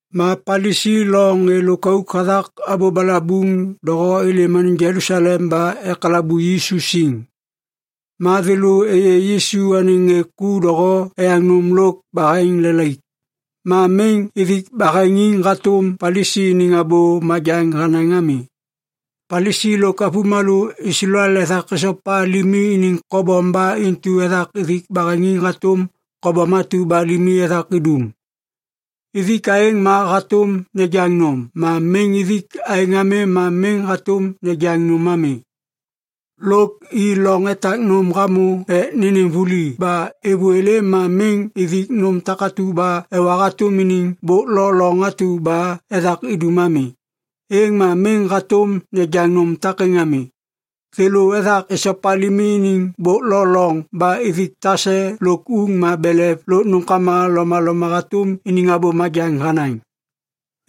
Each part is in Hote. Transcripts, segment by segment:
Ma Palisi lo ŋê lôkauk hathak abô balabuŋ doho êlêm anêŋ Jelusalem ba ekalabu Yisu siŋ. Ma thêlô êyê Yisu anêŋ ŋê ku doho eyaŋ nôm lôk baheŋ “lelaik” ma miŋ ithik baheŋiŋ hatôm Palisi iniŋ abô majaŋ hanaŋ ami. (Palisi lôk avômalô Islael ethak esopa limi iniŋ kobom ba intu ethak ithik baheŋiŋ hatôm kobom atu ba limi ethak idum. Ithik aêŋ ma hatôm nejaŋ nôm, ma miŋ ithik aêŋ ami ma miŋ hatôm nejaŋ nôm ami. Lôk i loŋ etak nôm hamô ek nênêm vuli ba êvô êlêm ma miŋ ithik nôm takatu ba ewa hatôm iniŋ bôk lo loŋ atu ba ethak idum ami, êŋ ma miŋ hatôm nejaŋ nôm takêŋ ami. Thêlô ethak esopa limi iniŋ bôk lo loŋ ba ithik tase lôk uŋ ma belev lôk nômkama lomaloma hatôm iniŋ abô majaŋ hanaŋ.)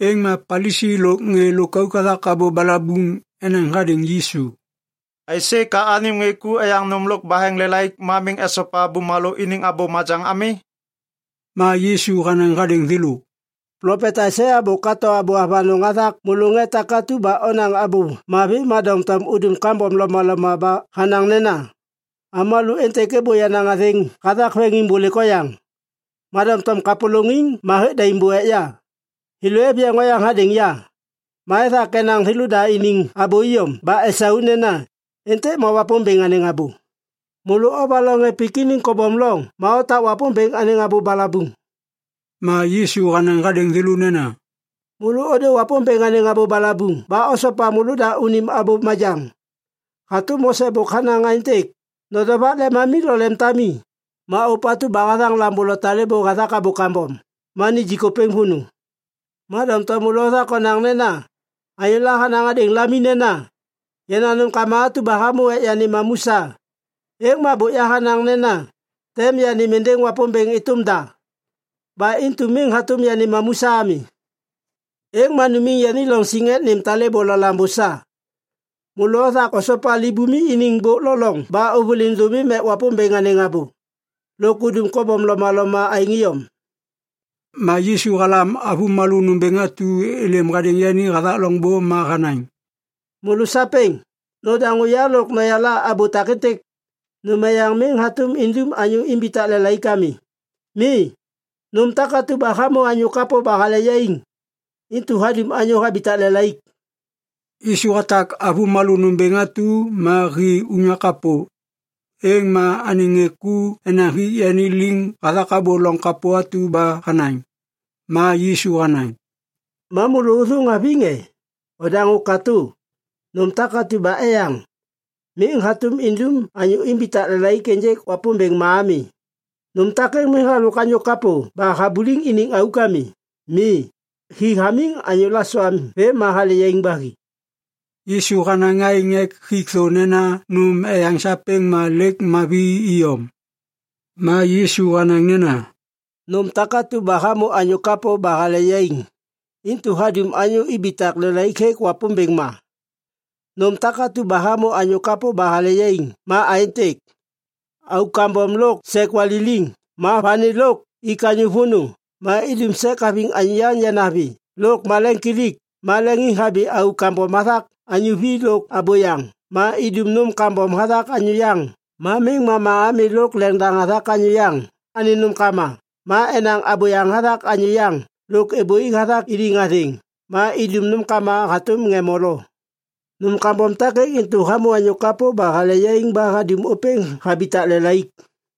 Êŋ ma Palisi lôk ŋê lôkauk hathak abô balabuŋ enaŋ hadêŋ Yisu, “Aisê ka anêm ŋê ku eyaŋ nôm lôk baheŋiŋ lelaik ma miŋ esopa bumalô iniŋ abô majaŋ ami?” Ma Yisu hanaŋ hadêŋ thêlô, “Plopet Aisaia bôk hato abô avanôŋ hathak môlô ŋê takatu ba onaŋ abô mavi ma doŋtom udum kambom lomaloma ba hanaŋ nena, “‘Avômalô êntêk êbô yenaŋ athêŋ hathak veŋiŋbôlêk oyaŋ. Ma doŋtom kapôlôŋiŋ ma hêk daim bô ek ya. Thêlô êv yeŋ oyaŋ hadêŋ ya. Ma ethak enaŋ thêlôda iniŋ abô iyom ba esau nena, “Êntêk ma Wapômbêŋ anêŋ abô.” ’ Môlô ovaloŋ ŋê pik iniŋ kobom loŋ ma otak Wapômbêŋ anêŋ abô balabuŋ.” Ma Yisu hanaŋ hadêŋ thêlô nena, “Môlô ôdô Wapômbêŋ anêŋ abô balabuŋ ba osopa môlôda unim abô majaŋ. Hatôm Mose bôk hanaŋ aêntêk, ‘Nodovak lemami lo lemtami’ ma ‘Ôpatu ba hathaŋ lambô lo talêbô hathak abô kambom, ma nijik ôpêŋ vônô.’ Ma doŋtom môlô othak onaŋ nena anyôla hanaŋ hadêŋ lami nena, ‘Yenaŋ nômkama atu ba hamô ek yanêm mamu sa, êŋ ma bôk yahanaŋ nena tem yanêm êndêŋ Wapômbêŋ êtôm da. Ba intu miŋ hatôm yanêm mamu sa ami.’ Êŋ ma numiŋ yani loŋ siŋ ek nêm talêbô lo lambô sa. Môlô othak osopa libumi iniŋ bôk lo loŋ ba ôvôliŋ dômiŋ ek Wapômbêŋ anêŋ abô. Lôk udum kobom lomaloma aêŋ iyom.” Ma Yisu halam avômalô nômbêŋ atu êlêm hadêŋ yani hathak loŋbô ma hanaŋ, “Môlô sapêŋ, nodaŋô ya lôk noyala abô takêntêk. Nôm eyaŋ miŋ hatôm indum anyô imbitak lelaik ami. Mi. Nôm takatu ba hamô anyô kapô ba hale yaiŋ, intu hadum anyô habitak lelaik.” Yisu hatak avômalô nômbêŋ atu ma hi unyak kapô. Êŋ ma anêŋ ŋê ku enaŋ hik yani liŋ hathak abô loŋ kapô atu ba hanaŋ. Ma Yisu hanaŋ, “Ma môlô ôthôŋ haviŋ e? Odaŋô katô! Nôm takatu ba eyaŋ, miŋ hatôm idum anyô imbitak lelaik ênjêk Wapômbêŋ ma ami. Nôm takêŋ miŋ halôk anyô kapô ba habuliŋ iniŋ auk ami. Mi, hi hamiŋ anyô lasoam vêm ma hale yaiŋ ba hi.” (Yisu hanaŋ aêŋ ek hik thô nena nôm eyaŋ sapêŋ ma lêk mavi iyom.) Ma Yisu hanaŋ nena, “Nôm takatu ba hamô anyô kapô ba hale yaiŋ, intu hadum anyô ibitak lelaik hêk Wapômbêŋ ma. Nôm takatu ba hamô anyô kapô ba hale yaiŋ ma aêntêk: auk kambom lôk sek waliliŋ ma vani lôk ik anyô vônô ma idum sek haviŋ anyô yaŋ yanavi lôk maleŋiŋkilik ma leŋiŋhabi auk kambom hathak anyô vi lôk abôyaŋ ma idum nôm kambom hathak anyô yaŋ ma miŋ mama ami lôk leŋdaŋ hathak anyô yaŋ anêŋ nômkama ma enaŋ abôyaŋ hathak anyô yaŋ lôk êbôi hathak iniŋ athêŋ ma idum nômkama hatôm ŋê molo. Nôm kambom takêŋ intu hamô anyô kapô ba hale yaiŋ ba hadum ôpêŋ habitak lelaik.”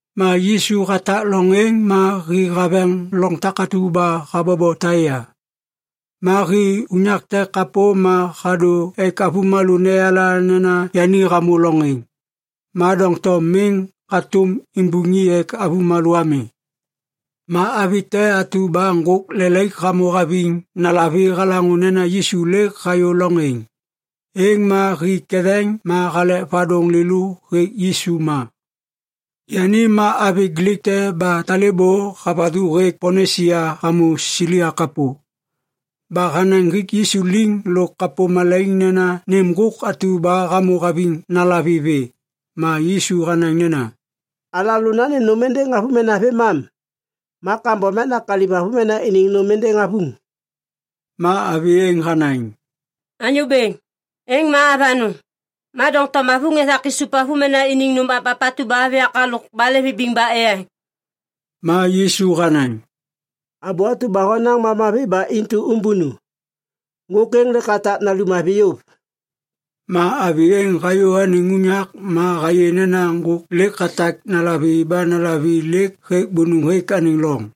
Ma Yisu hatak loŋ êŋ ma hi haveŋ loŋ takatu ba habobo Taia. Ma hi unyak te kapô ma hadô ek avômalô neyala nena yani hamô loŋ êŋ. Ma doŋtom miŋ hatôm imbuŋ i ek avômalô ami. Ma avi te atu ba ŋgôk lelaik hamô haviŋ nalavi halaŋô nena Yisu lêk hayô loŋ êŋ. Êŋ ma hi ketheŋ ma halek vadôŋ lêlô hêk Yisu ma. Yani ma avi Glik te ba talêbô havathu hêk Ponisia hamô Silia kapô. Ba hanaŋ hik Yisu liŋ lôk kapô malaiŋ nena nêm ŋgôk atu ba hamô haviŋ nalavi vê. Ma Yisu hanaŋ nena, “Alalô nanêm nôm êndêŋ avômena vêmam. Ma kambom ek nakaliv avômena iniŋ nôm êndêŋ avuŋ.” Ma avi êŋ hanaŋ, “Anyô Bêŋ, êŋ ma avanôŋ. Ma doŋtom avuŋ ethak isup avômena iniŋ nôm mapmap atu ba hêv yak halôk balê vibiŋ ba eyaŋ.” Ma Yisu hanaŋ, “Abô atu ba honaŋ ma mavi ba intu ômbônu. Ŋgôk êŋ lêk hatak nalum avi yôv.” Ma avi êŋ hayô anêŋ unyak ma hayê nena ŋgôk lêk hatak nalavi ba nalavi lêk hêk bônôŋ hêk anêŋ loŋ.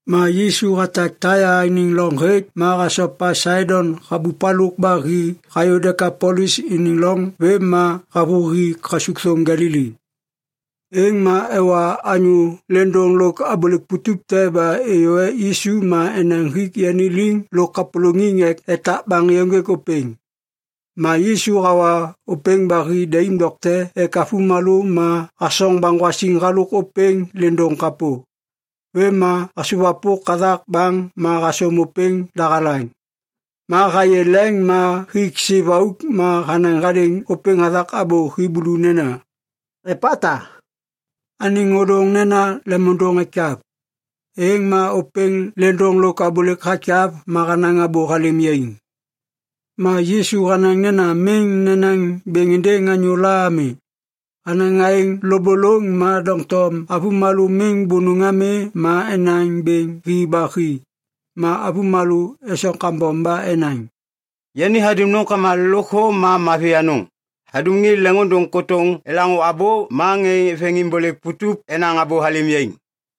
Ma Yisu hatak Taia iniŋ loŋ hêk ma hasopa Saidon habup halôk ba hi hayô Dekapolis iniŋ loŋ vêm ma havôhi kasukthôm Galili. Êŋ ma ewa anyô lêndôŋ lôk abôlêk putup te ba êyô ek Yisu ma enaŋ hik yani liŋ lôk kapôlôŋiŋ ek etak baŋ êyôŋgêk ôpêŋ. Ma Yisu hawa ôpêŋ ba hi daim dokte ek avômalô ma hasoŋ baŋgwasiŋ halôk ôpêŋ lêndôŋ kapô. Vêm ma hasôwapôk hathak baŋ ma hasôm ôpêŋ dahalaŋ. Ma hayê leŋ ma hik siv auk ma hanaŋ hadêŋ ôpêŋ hathak abô Hiblu nena, “Epata!” (Anêŋ ôdôŋ nena lemôndôŋ ekyav.) Êŋ ma ôpêŋ lêndôŋ lo abôlêk hakyav ma hanaŋ abô halêm yaiŋ. Ma Yisu hanaŋ nena miŋ nenaŋ bêŋ êndêŋ anyôla ami. Hanaŋ aêŋ lôbôlôŋ ma doŋtom avômalô miŋ bônôŋ ami ma enaŋ bêŋ hi ba hi. Ma avômalô esoŋ kambom ba enaŋ, “Yani hadum nômkama lôkthô ma mavi anôŋ. Hadum ŋê leŋôndôŋ kôtôŋ elaŋô abô ma ŋê veŋiŋbôlêk putup enaŋ abô halêm yaiŋ.”